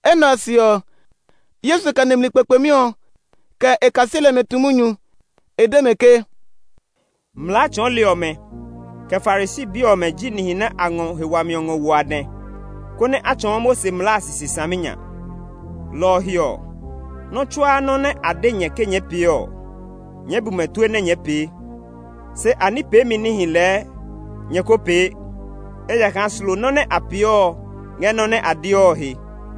Enɛ ɔ se ɔ, Yesu kɛ nimli kpekpemi ɔ, kɛ e kaseli ɔmɛ tu munyu. E de mɛ ke, “Mlaa tsɔɔli ɔmɛ, kɛ Farisi bi ɔmɛ ji nihi nɛ a ngɔ he wami ngɔ wo a dɛ, konɛ a tsɔɔ Mose mlaa a sisi saminya. Lɔ ɔ he ɔ, nɔ́ tsuaa nɔ́ nɛ a de nyɛ ke nyɛɛ pee ɔ, nyɛɛ bu mɛ tue nɛ nyɛɛ pee. Se a ní peemi níhi lɛɛ nyɛ ko pee; ejakaa slo nɔ́ nɛ a peeɔ ngɛ nɔ́ nɛ a deɔ he.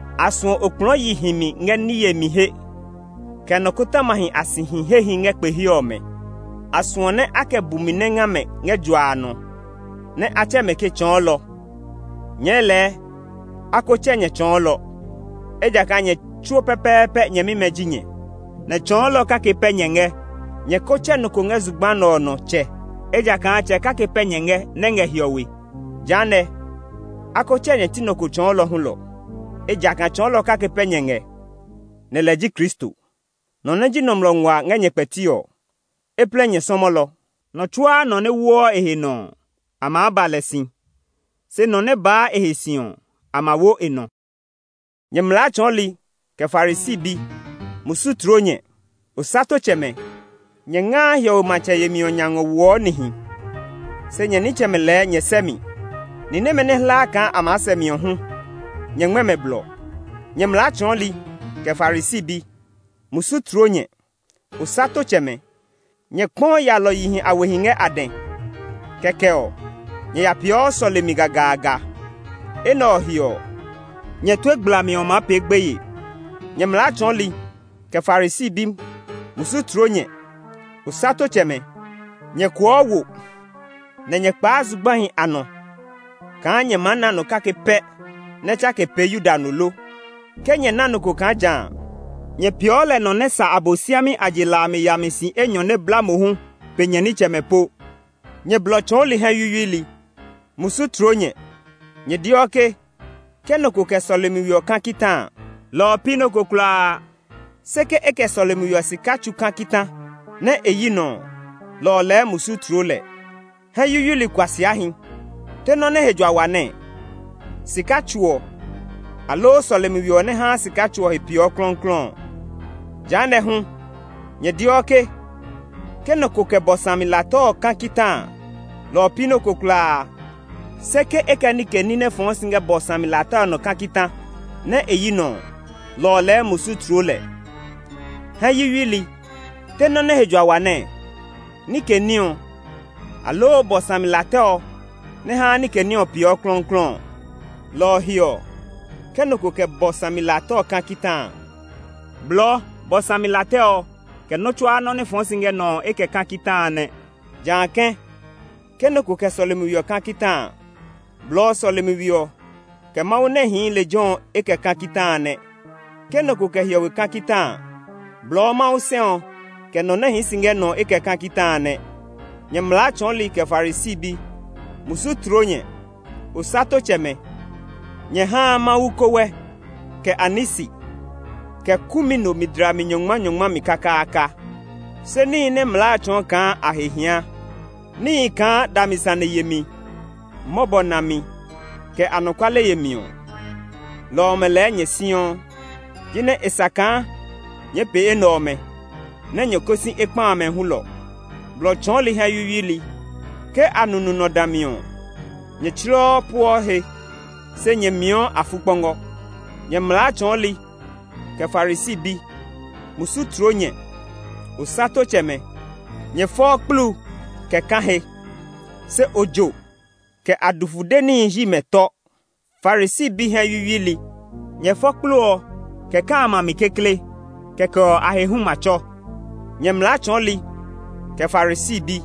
A suɔ okplɔɔ yi himi ngɛ ní yemi he, kɛ nikɔtɔmahi a sihi hehi ngɛ kpe he ɔmɛ; a suɔ nɛ a kɛ bumi nɛ nga mɛ ngɛ jua nɔ, nɛ a tsɛ mɛ ke, ‘Tsɔɔlɔ!’ Nyɛɛ lɛɛ, a ko tsɛ nyɛ ‘Tsɔɔlɔ’, ejakaa nyɛ tsuo pɛpɛɛpɛ nyɛmimɛ ji nyɛ, nɛ tsɔɔlɔ kake pɛ nyɛ ngɛ. Nyɛ ko tsɛ nɔ ko nɔ ko ngɛ zugba a nɔ ‘Tsɛ’, ejakaa Tsɛ kake pɛ nyɛ ngɛ nɛ ngɛ hiɔwe. Jehanɛ, a ko tsɛ nyɛ ti nɔ ko ‘Tsɔɔlɔ’ hulɔ; ejakaa tsɔɔlɔ kake pɛ nyɛ ngɛ, nɛ lɛ ji Kristo. Nɔ nɛ ji nɔmlɔ nguaa ngɛ nyɛ kpɛti ɔ, e plɛ nyɛ sɔmɔlɔ. Nɔ tsuaa nɔ nɛ woɔ e he nɔ ɔ, a maa ba lɛ si; se nɔ nɛ baa e he si ɔ, a ma wo e nɔ. “Nyɛ mlaa tsɔɔli, kɛ Farisi bi, musu tloo nyɛ! Osatotsɛmɛ! Nyɛ ngaa hiɔwe matsɛ yemi ɔ nya ngɔ woɔ nihi, se nyɛ nitsɛmɛ lɛɛ nyɛ sɛ́ mi. Ni nɛmɛ nɛ a hlaa kaa a maa sɛ mi ɔ hu nyɛ ngmɛ́ mɛ blɔ! [ Nyɛ mlaa tsɔɔli, kɛ Farisi bi, musu tloo nyɛ! Osatotsɛmɛ! Nyɛ kpɔɔ yalɔyihi a wehi ngɛ a dɛ. Kɛkɛ ɔ, nyɛ ya peeɔ sɔlemi gagaaga! Enɛ ɔ he ɔ, nyɛ tue gblami ɔ maa pee gbeye.] “Nyɛ mlaa tsɔɔli, kɛ Farisi bi, musu tloo nyɛ! Osatotsɛmɛ! Nyɛ kuɔɔ wo, nɛ nyɛ kpaa zugbahi a nɔ kaa nyɛ maa na nɔ kake pɛ nɛ tsake pee Yuda no lo. Ke nyɛ na nɔ ko kaa ja a, nyɛ peeɔ lɛ nɔ nɛ sa Abosiami a je la a mi yami si enyɔ nɛ bla mohu pe nyɛ nitsɛmɛ po! “Nyɛ blɔ tsɔɔli hɛ yuyuili, musu tloo nyɛ! Nyɛ deɔ ke, ‘Ke nɔ ko kɛ sɔlemi we ɔ ka kita a, lɔ ɔ pi nɔ́ ko kulaa. Se ke e kɛ sɔlemi we ɔ sika tsu ka kita nɛ e yi nɔ ɔ, lɔ ɔ lɛɛ musu tloo lɛ.’ Hɛ yuyuili kuasiahi! Te nɔ́ nɛ he jua wa nɛɛ? Sika tsu ɔ, aloo sɔlemi we ɔ nɛ haa sika tsu ɔ peeɔ klɔuklɔu ɔ? Jehanɛ ɔ hu, nyɛ deɔ ke, ‘Ke nɔ ko kɛ bɔ sami la tɛ ɔ ka kita a, lɔ ɔ pi nɔ́ ko kulaa. Se ke e kɛ nike ní nɛ fɔɔ si ngɛ bɔ sami la tɛ ɔ nɔ ɔ ka kita nɛ e yi nɔ ɔ, lɔ ɔ lɛɛ musu tloo lɛ.’ Hɛ yuyuili! Te nɔ́ nɛ he jua wa nɛɛ? Nike ní ɔ, aloo bɔ sami la tɛ ɔ nɛ haa nike ní ɔ peeɔ klɔuklɔu ɔ? Lɔ ɔ he ɔ, ke nɔ ko kɛ bɔ sami la tɛ ɔ ka kita a, blɔɔ bɔ sami la tɛ ɔ, kɛ nɔ́ tsuaa nɔ́ nɛ fɔɔ si ngɛ nɔ ɔ e kɛ ka kita a nɛ. Jã kɛ̃, ke nɔ ko kɛ sɔlemi we ɔ ka kita a, blɔɔ sɔlemi we ɔ, kɛ Mawu nɛ hii lejɛ ɔ e kɛ ka kita a nɛ. Ke nɔ ko kɛ hiɔwe ka kita a, blɔɔ Mawu sɛ ɔ, kɛ nɔ nɛ hii si ngɛ nɔ ɔ e kɛ ka kita a nɛ. “Nyɛ mlaa tsɔɔli kɛ Farisi bi! Musu tloo nyɛ! Osatotsɛmɛ! Nyɛ haa Mawu kowɛ, kɛ anisi, kɛ kumino mi dlami nyɔngmanyɔngma mi kakaaka, se níhi nɛ mlaa a tsɔɔ kaa a he hia, níhi kaa dami sane yemi, mɔbɔ nami, kɛ anɔkuale yemi ɔ, lɔ ɔmɛ lɛɛ nyɛ siɔ. Jinɛ e sa kaa nyɛɛ pee enɛ ɔmɛ, nɛ nyɛ ko si ekpa amɛ hulɔ. Blɔ tsɔɔli hɛ yuyuili! Ke anunu nɔ dã mi ɔ, nyɛ tsleɔ pueɔ he, se nyɛ mii afukpɔngɔ! “Nyɛ mlaa tsɔɔli, kɛ Farisi bi! Musu tloo nyɛ! Osatotsɛmɛ! Nyɛ fɔɔ kplu kɛ kã he, se ojo, kɛ adufude níhi hyi mɛ tɔ. Farisi bi hɛ yuyuili! Nyɛ fɔ kplu ɔ, kɛ kã a a mi kekle, kɛkɛ ɔ a he hu ma tsɔ! “Nyɛ mlaa tsɔɔli, kɛ Farisi bi!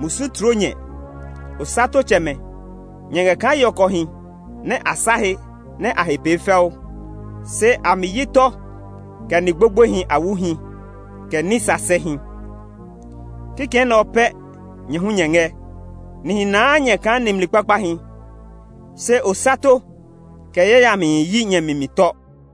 Musu tloo nyɛ! Osatotsɛmɛ! Nyɛ ngɛ kaa yɔkɔhi nɛ a sa a he nɛ a he pee fɛu, se a mi hyi tɔ kɛ ni gbogboehi a wuhi, kɛ ní sasɛhi. Kikɛ nɛ ɔ pɛ nyɛ hu nyɛ ngɛ; nihi naa nyɛ kaa nimli kpakpahi, se osato, kɛ yayami hyi nyɛ mi mi tɔ.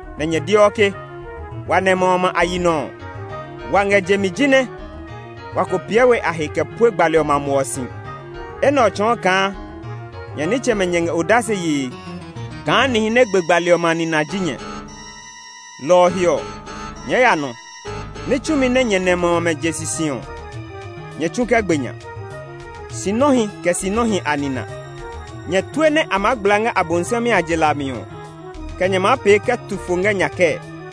nɛ nyɛ deɔ ke, ‘Wa nɛmɛ ɔmɛ a yi nɔ ɔ, wa ngɛ je mi jinɛ wa ko piɛ we a he kɛ pue gbali ɔmɛ a muɔ si.’ Enɛ ɔ tsɔɔ kaa nyɛ nitsɛmɛ nyɛ ngɛ odase yee kaa nihi nɛ gbe gbali ɔmɛ a nina ji nyɛ. Lɔ ɔ he ɔ, nyɛɛ ya nɔ! Ní tsumi nɛ nyɛ nɛmɛ ɔmɛ je sisi ɔ, nyɛ tsu kɛ gbe nya! Sinɔhi kɛ sinɔhi a nina! Nyɛ tue nɛ a maa gbla ngɛ Abosiami a je la a mi ɔ, kɛ nyɛ maa pee kɛ tu fo ngɛ nya kɛɛ?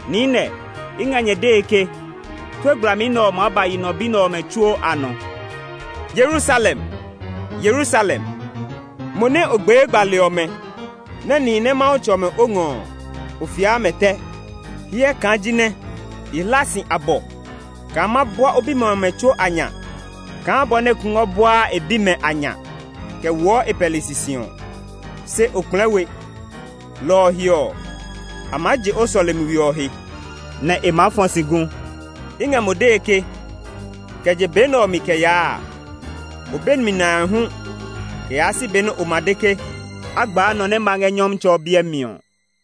Niinɛ, i ngɛ nyɛ dee ke, tue gblami nɛ ɔ maa ba yi nɔ bi nɛ ɔmɛ tsuo a nɔ! “Yerusalem! Yerusalem! Mo nɛ o gbee gbali ɔmɛ, nɛ nihi nɛ Mawu tsɔ mɛ o ngɔ ɔ, o fiaa mɛ tɛ! Hyɛ kaa jinɛ i hla si abɔ kaa ma bua o bimɛ ɔmɛ tsuo a nya kaa bɔ nɛ kungwɔ buaa e bimɛ a nya kɛ woɔ e pɛli sisi ɔ. Se o kplɛɛ we! Lɔ ɔ he ɔ, a maa je o sɔlemi we ɔ he, nɛ e maa fɔ si gu. I ngɛ mo dee ke, kɛ je be nɛ ɔ mi kɛ yaa a, o be mi nae hu kɛ yaa si be nɛ o ma de ke, ‘A gbaa nɔ nɛ ma ngɛ Nyɔmtsɛ ɔ biɛ mi ɔ.’”